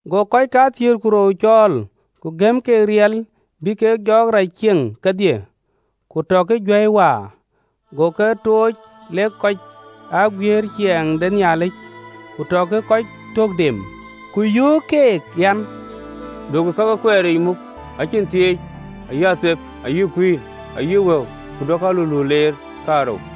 Go kɔc kathiëër ku rou cɔɔl, ku gëm keek riɛl bï kek jɔɔk rac cieŋ kedhie, ku tɔkï juäi waar. Go ke tooc lek kɔc aa guiëër ciɛɛŋ de Nhialic, ku tɔkï kɔc tök dem. Ku yöök keek an, “Duökï ka ke kueeric muk, acïn thieec, ayï athep, ayï kuïn, ayï wëu, ku duökï aluluut leer kaarou.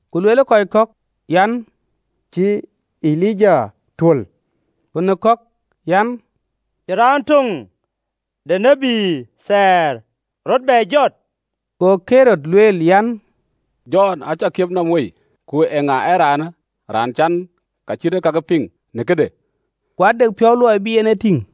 Ku lueel kɔc kɔ̈k an, cï Elija tuöl, ku në kɔ̈k an, cï raan töŋ de tït thɛɛr rɔt bɛ jɔt. Go Ɣerod lueel an, “Jɔn acä kiɛp nɔm wei, ku eeŋa ee raanë, raan cän ka cït ee kakë piŋ në këde?” Ku ade piɔ̈u luɔi bï en e tïŋ.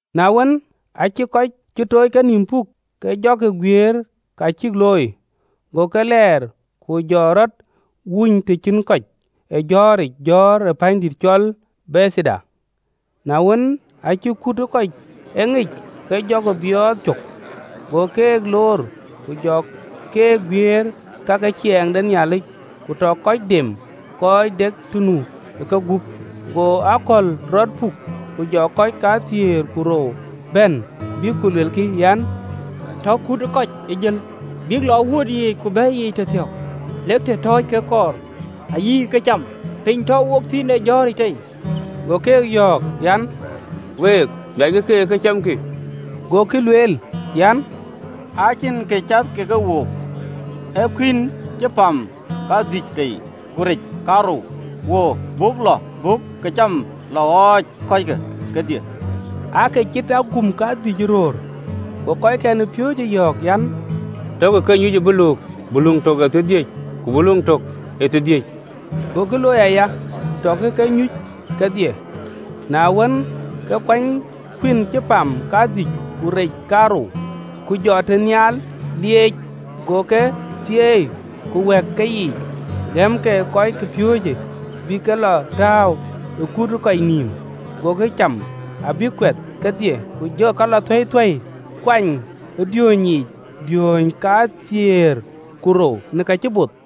Na wën, aacï kɔc cï tooc kenïïm puk, ke jɔkï guiëër ka cïk looi. Go ke lɛɛr, ku jɔ rɔt wuony të cïn kɔc ë jɔ̈ɔ̈ric jɔ̈ɔ̈r ë pänydït cɔl Bethaida. Na wën, aacï kut ë kɔc e ŋic, ke jɔkï biɔɔth cök: go keek loor, ku jɔ keek guiëër ka ke ciɛɛŋ de Nhialic, ku tɔ kɔc dem kɔc de kë nu ë kegup. Go akɔ̈l rɔt puk, ku jɔ kɔc kathiëër ku rou bɛ̈n, bïk ku luelkï an, “Tɔ kut ë kɔc jël, bïk lɔ ë wuöt yiic ku bɛ̈i yiic tëthiɔ̈k lek të tɔ̈ɔ̈c kek kɔɔr, ayï këcam piny tɔ̈u wok thïn ee jɔ̈ɔ̈ric tei.” Go keek yɔ̈ɔ̈k an, “Week, miackï keek ë këcamkï.” Gokï lueel an, “Acïn kë cath ke wook, ee kuïn cï pam kadhïc tei, ku rec kaarou. Kɔɔr buk lɔ, buk këcam lɔ ɣɔ̈c keek kedhie? Aake cït agum kadhïny ë röör. Go kɔckɛn ë piööcë yɔ̈ɔ̈k an, “Takï ke nyuc ë buluuk, buluŋ tök ee thiërdhïc, ku buluŋ tök ee thiërdhïc.” Gokï looi aya, tɔkï ke nyuc kedhie. Na wën, ke kuany kuïn cï pam kadhïc ku rec kaarou, ku jɔ tënhial lieec, go ke thieei, ku wɛ̈k keyiic, gëm ke kɔcpiööcë, bïk ke lɔ tääu ë kut ë kɔc nïïm. Gokï cam, abïk kuɛth kedhie: ku jɔkï ka lɔ thueithuei kuany ë diööny yiic diööny kathiëër ku rou në ka cï both.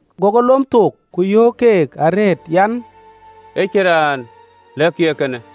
Go ke lom thook, ku yöök keek arëët an, ë cïn raan lɛ̈kkï ee kënë.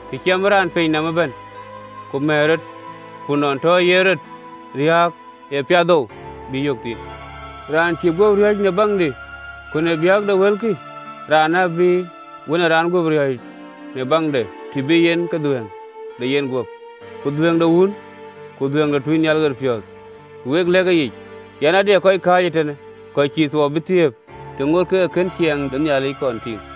Të ciɛmë raan piny nɔm ëbɛ̈n, ku mɛ̈ɛ̈r rɔt, ku nɔn tɔ yen rɔt riääk, ee piathou bï yök thïn? Raan cï guöp riɔ̈ɔ̈c në biäkdï ku në biäk de wëlkï, raanë abï Wën ë Raan guöp riɔ̈ɔ̈c në biäkde, të bï yen ke dhuëëŋ de yenguöp, ku dhuëëŋ de wun, ku dhuëëŋ de tuucnhial ɣeriic. Ka wek lɛ̈k yic an, ade kɔc kääc ee tënë, kɔc cïï thuɔɔu bï thiëëp, të ŋoot kek ke ke kën ciɛɛŋ de Nhialic kɔn tïŋ.”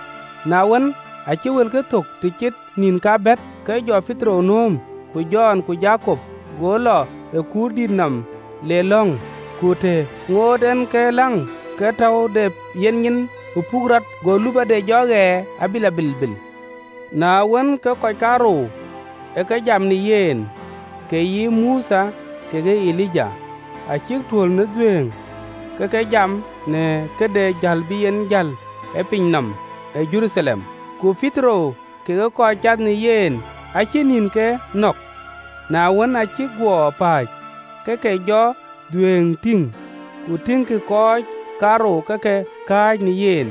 Na wën, aacï wëlkë thök të cït nïn kabɛ̈t, ke jɔ Petero nööm, ku Jɔn ku Jakop, go lɔ ë kuurdït nɔm, le lɔ̈ŋ. Ku të ŋoot en ke läŋ, ke täu de yenyin ë puk rɔt, go lupɔde jɔ ɣɛɛr abï lɔ bilbil. Na wën, ke kɔc kaarou ë ke jam në yen, ee yï Mothe kekë Elija: acïk tuöl në dhuëëŋ ke ke jam në këde jäl bï en jäl në piny nɔm ë Jeruthalem. Ku Petero kekë kɔc cath në yen acï nïn ke nɔ̈k: na wën, aa cïk guɔ pääc, ke ke jɔ dhuëëŋde tïŋ, ku tïŋkï kɔc kaarou ke ke kääc në yen.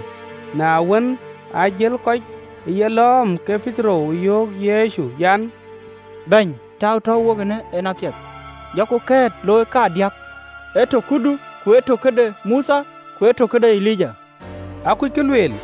Na wën, aa jël kɔc ë yelɔ̈ɔ̈m, ke Petero yöök Yecu an, “Bɛ̈ny, täu tɔ̈u wok eenë en apiɛth: jɔku kɛ̈ɛ̈t looi kadiäk, ye tök këdu, ku ye tök këde Mothe ku ye tök këde Elija.” (Akuc kë lueel.)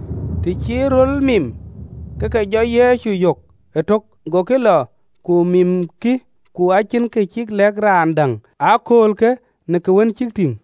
Të cï röl mim, ke ke jɔ Yecu yök etök. Gokï lɔ ku mimkï, ku cïn kë cïk lɛ̈k raan däŋ ë aköölkë në ka wën cïk tïŋ.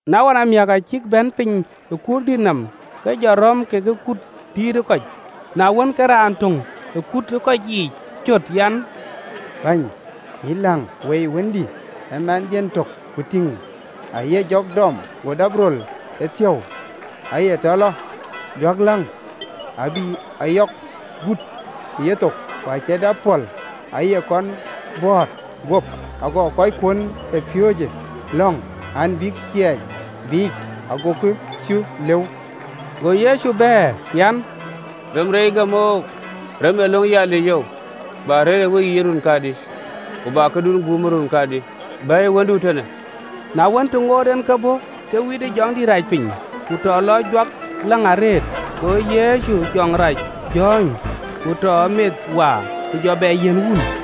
Na ɣɔn amiäk, aa cïk bɛ̈n piny ë kuurdït nɔm, ke jɔ rɔ̈m ke kut dïït ë kɔc. Na wën, ke raan töŋ ë kut ë kɔc yiic cöt an, “Bɛ̈ny, yïn läŋ, woi wëndï: ee mɛnhdiën tök: Ku tïŋ, aye jɔk dɔm, go dap röl ëthiäu, aye tɔ lɔ juɔ̈kläŋ, abï ayɔ̈k gut ë yethok, ku acie dap pɔ̈l, aye kɔn bɔ̈ɔ̈t guöp. Aguɔ kɔckuön ë piööcë lɔ̈ŋ an, bïk cieec biic, agokï cuö lëu.” Go Yecu bɛ̈ɛ̈r an, “Rem reec gäm oou, rem ee löŋ yalic oou, bä rëër ë weyiic ë run kadï, ku bä kakun guum ë run kadï?” Go lueel an, “Bɛ̈ɛ̈iyë wëndu ee tënë.” Na wën, të ŋoot en ke bɔ̈, ke witë jɔŋ rac piny, ku tɔ lɔ juɔ̈kläŋ arëët. Go Yecu jɔŋ rac jɔ̈ɔ̈ny, ku tɔ meth waar, ku jɔ bɛ yiɛ̈n wun.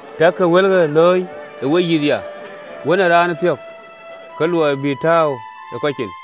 “Takï wëlke lööny ë weyïth ya! Wën ë Raan ë thiɔ̈k ke luɔi bï ë tääu ë kɔc cin.”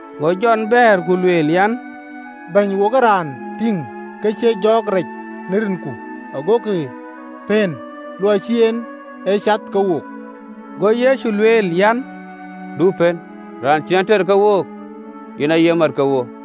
Go Jɔn bɛ̈ɛ̈r ku lueel an, “Bɛ̈ny, wo ë raan tïŋ ke ciec jɔɔk rac në rinku, agoku pëën, luɔi cïï en ee cath ke wook.” Go Yecu lueel an, “Du pën: raan cïn ater ke wook, yen aye mat ke wook.”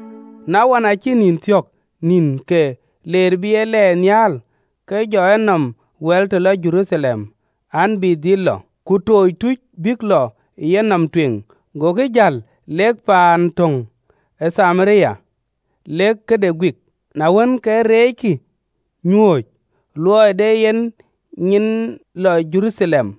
Na ɣɔn, aacï nïn thiɔ̈k nïn ke leer bï ye lɛɛr nhial, ke jɔ enɔm wɛ̈l të lɔ Jeruthalem an, bï dhil lɔ. Ku aacï tuuc tooc bïk lɔ ë yenɔm tueŋ, gokï jäl, lek paan töŋ ë Thamaria, lek këde guik. Na wën, ke reeckï nyuööc, luɔi de en nyin lɔ Jeruthalem.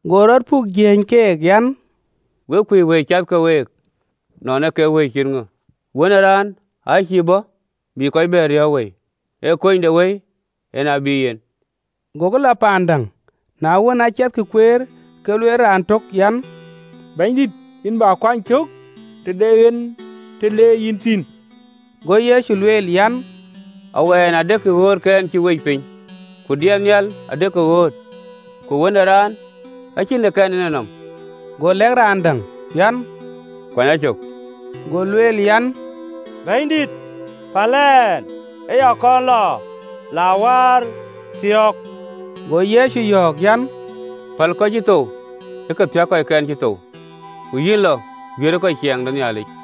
Go rɔt puk, jiëëny keek an, “Wek kuc wëi cath ke week nɔn ee kek wëi cït ŋö. Wën ë Raan aa cïï bɔ̈ bï kɔc bɛ̈n riɔ̈ɔ̈k wëi, ee kunydewëi en ë bï yen.” Gokï lɔ paan däŋ. Na wën, aa ciɛthkï kueer, ke lueel raan tök an, “Bɛ̈nydït, yïn bä kuany cök të de en të le yïn thïn.” Go Yecu lueel an, “Awɛn adekï ɣöötkɛn cïk wec piny, ku diɛt nhial adekï ɣööt, ku Wën ë Raan acïn të kɛn en enɔm.” Go lɛ̈k raan däŋ an, “Kuany a cök.” Go lueel an, “Bɛ̈nydït, päl ɛn ë ya kɔn lɔ la wäär thiɔ̈k.” Go Yecu yɔ̈ɔ̈k an, “Päl kɔc cï thou ë ke thiäk kɔckɛn cï thou: ku yïn lɔ, guiëërë kɔc ciɛɛŋ de Nhialic.”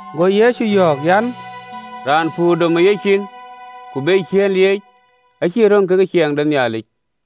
Go Yecu yɔ̈ɔ̈k an, “Raan ë puur dɔm ë yeciin, ku be ciëën lieec, acïï röŋ ke ciɛɛŋ de Nhialic.”